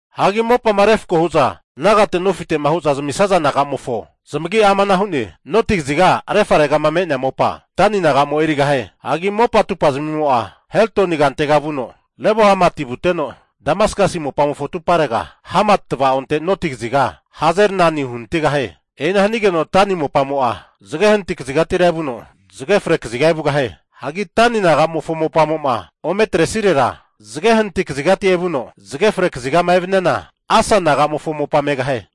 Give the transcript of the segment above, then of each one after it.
Hagi mopama refko hu'za nagate nofite'ma hu'za zamisaza naga'mofo zamagi'a amana hu'ne, Noti kaziga refaregama me'nea mopa Dani naga'mo erigahie. Hagi mopa atumpazamimo'a Hetloni kantega vuno Lebo-hamati vuteno, Damaskasi mopamofo atuparega Hamati tavaonte noti kaziga Hazar-enani uhanatigahie. E'ina hanigeno Dani mopamo'a zage hanati kazigatira evuno, zage fre kaziga evugahie. Hagi Dani nagamofo mopamo'ma ome atresirera, zage hanati kazigati evuno zage fre kazigama evaniana, Asa naga'mofo mopa megahie.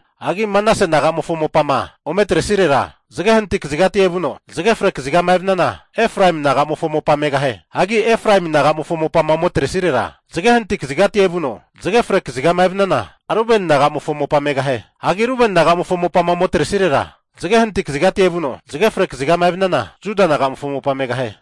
Hagi Manase nagamofo mopama ome atresirera, zage hanati kazigati evuno zage fre kazigama evaniana Efraemi naga'mofo mopa megahie. Hagi Efraemi naga'mofo mopama ome atresirera, zage hanati kazigati evuno zage fre kazigama evaniana, Rubeni naga'mofo mopa megahie. Hagi Rubeni naga'mofo mopama ome atresirera, zage hanati kazigati evuno zage fre kazigama evaniana Juda naga'mofo mopa megahie.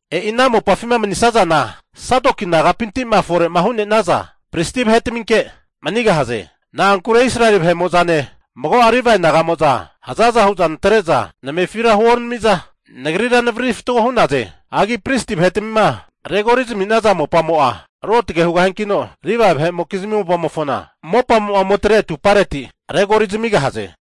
E'i ana mopafima manisazana Sadoki nagapinti'ma fore'ma hu'nenaza pristi vahetaminke manigahaze. Na'ankure Israeli vahe'mo'zane mago'a Livae naga'mo'za hazaza hu'za natre'za namefira huonami'za, nagrira navariri fatgo hu'naze. Hagi pristi vahetmima regori zami'naza mopamo'a ruotge hugahiankino, Livae vahe'mokizmi mopamo'ma ome atre atupareti pristi vahera mopa regori zamigahaze.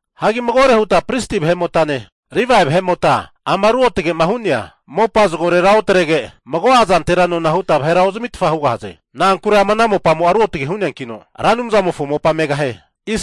Hagi magore huta pristi vahe'motane Livae vahemota ama ruotge'ma hu'nea mopa zagorera otrege mago'a zantera nona huta vahera ozamitfa hugahaze. Na'ankure ama ana mopamo'a ruotge hu'neakino, Ra Anumzamofo mopa megahie.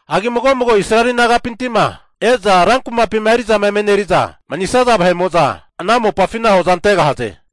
Hagi mago mago Israeli nagapinti'ma e'za rankumapima eri'zama emeneri'za manisaza vahe'mo'za ana mopafina hoza antegahaze.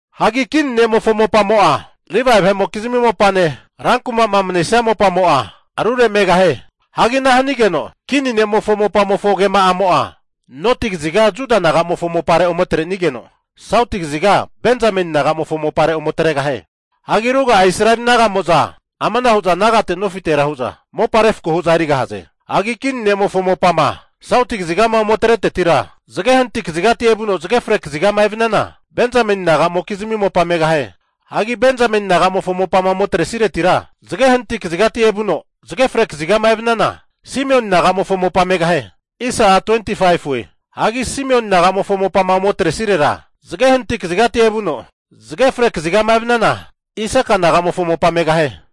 Hagi kini ne'mofo mopamo'a Livae vahe'mokizmi mopane rankumama manesia mopamo'a rure megahie. Hagi ana hanigeno kini nemofo mopamofo agema'amo'a noti kaziga Juda nagamofo mopare ome atre'nigeno, sauti kaziga Benzameni naga'mofo mopare ome atregahie. Hagi ruga'a Israeli naga'mo'za amana hu'za nagate nofitera hu'za mopa refko hu'za erigahaze. Hagi kini ne'mofo mopama sauti kazigama ome atretetira, zage hanati kazigati evuno zage fre kazigama evaniana, Benzameni naga'mokizmi mopa megahie. Hagi Benzameni naga'mofo mopama ome atresiretira, zage hanati kazigati evuno zage fre kazigama evaniana, Simioni nagamofo mopa megahie. Hagi Simioni naga'mofo mopama ome atresirera, zage hanati kazigati evuno zage fre kazigama evaniana, Isaka naga'mofo mopa megahie.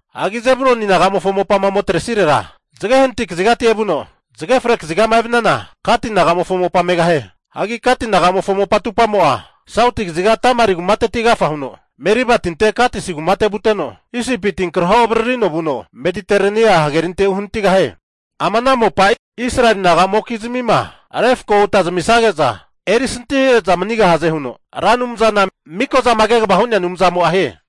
Hagi Zebuluni naga'mofo mopama ome atresirera, zage hanati kazigati evuno zage fre kazigama evaniana, Gati naga'mofo mopa megahie. Hagi Gati nagamofo mopa atumpamo'a sauti kaziga Tamari kumateti agafa huno Mariba tinte Kadesi kumate vuteno, Isipi tinkraho avaririno vuno Medeterenia hagerinte uhanatigahie. Ama ana mopa Israeli naga'mokizmi refko huta zamisage'za, eri santihare'za manigahaze huno Ra Anumzana Mikozama Kegava Hu'nea Anumzamo'a hie.